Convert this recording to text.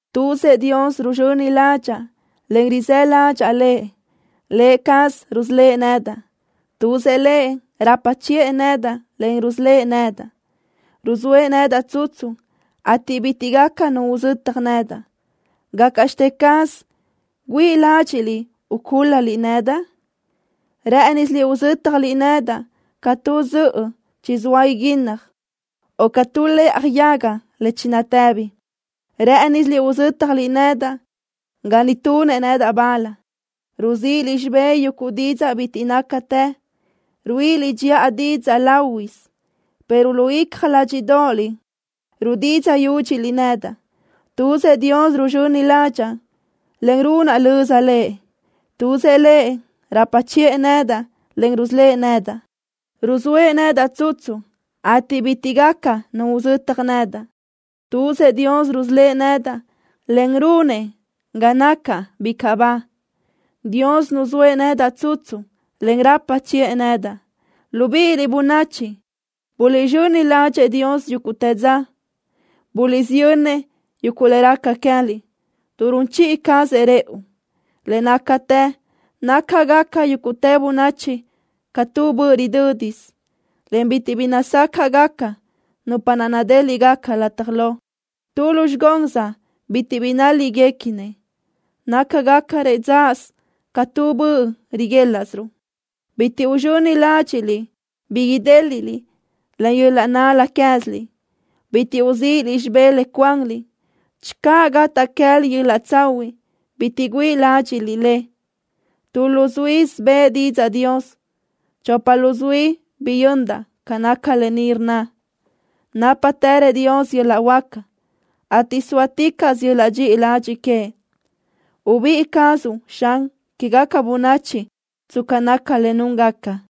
¡Tuzëʼ Dios ruzxöni ládxaʼa, en rizë́ ládxaʼa Lëʼ! ¡Lë cazëʼ rusölë́ʼ nedaʼ! ¡Tuzëʼ Lëʼ rapa chiʼë nedaʼ, en rusölë́ʼ nedaʼ! ¡Ruzóëʼ nedaʼ tsutsu, ateʼ bitiʼ gaca nu uzötaj nedaʼ! ¿Gácaʼxte caz güíʼi ládxiʼliʼ ucúl-laliʼ nedaʼ? Rë́ʼënisiliʼ uzö́tjaliʼ nedaʼ ca tu zöʼö chizóa iguínnaj, o ca tu lëʼaj yaga le chinatëbi. Rë́ʼënisiliʼ uzö́tjaliʼ nedaʼ ga ni tunëʼ nedaʼ bal. Ruzíʼiliʼ xibé yuguʼ didzaʼ bitiʼ nácatë. Ruíʼiliʼ dxiʼa didzaʼ láhuiʼsö, pero lu icja ládxiʼdoʼoliʼ rudidzaʼ yúdxiliʼ nedaʼ. ¡Tuzëʼ Dios ruzxöni ládxaʼa, en runaʼ löza Lëʼ! ¡Tuzëʼ Lëʼ rapa chiʼë nedaʼ, en rusölë́ʼ nedaʼ! ¡Ruzóëʼ nedaʼ tsutsu, ateʼ bitiʼ gaca nu uzötaj nedaʼ! ¡Tuzëʼ Dios rusölë́ʼ nedaʼ, en runëʼ ga nacaʼ bicaʼ ba! ¡Dios nuzóëʼ nedaʼ tsutsu, en rapa chiʼë nedaʼ! Libíʼiliʼ, bönachi, buliʼzxöni ládxëʼë Dios yúguʼtë dza. Buliʼsiyönnëʼ yuguʼ le raca queë́liʼ, tuʼ run chiʼi cazëʼ rëʼu. Le nácatë nácagaca yúgutë bönachi ca tu böʼ ridö́disö, en bitiʼ bi nazácaʼgaca nupa naʼ nadéliʼgaca lataj lo. Tu lu zxigóns bitiʼ bi nál-líʼguequinëʼ. Nácagacarëʼ dzáʼasö ca tu böʼ riguélaʼsiruʼ. Bitiʼ uzxöni ládxiʼliʼ bi idéliʼliʼ len yöl-laʼ nál-la queë́ziliʼ. Bitiʼ uzíʼiliʼ xibé le cuanliʼ. Channö gataʼ queë́liʼ yöl-laʼ tsahuiʼ, bitiʼ güíʼi ládxiʼliʼ le. Tu luzuísö bëʼë didzaʼ Dios. Chopa luzuí biyöndaʼ ca naca lë ni rnna: “Nápatërëʼ Dios yöl-laʼ huáca, ateʼ zóaticaʼsö yöl-laʼ dxiʼi ladxiʼ queëʼ.” Ubíʼi cazuʼ, Xan, quégaca bönachi tsca naca le núngaca.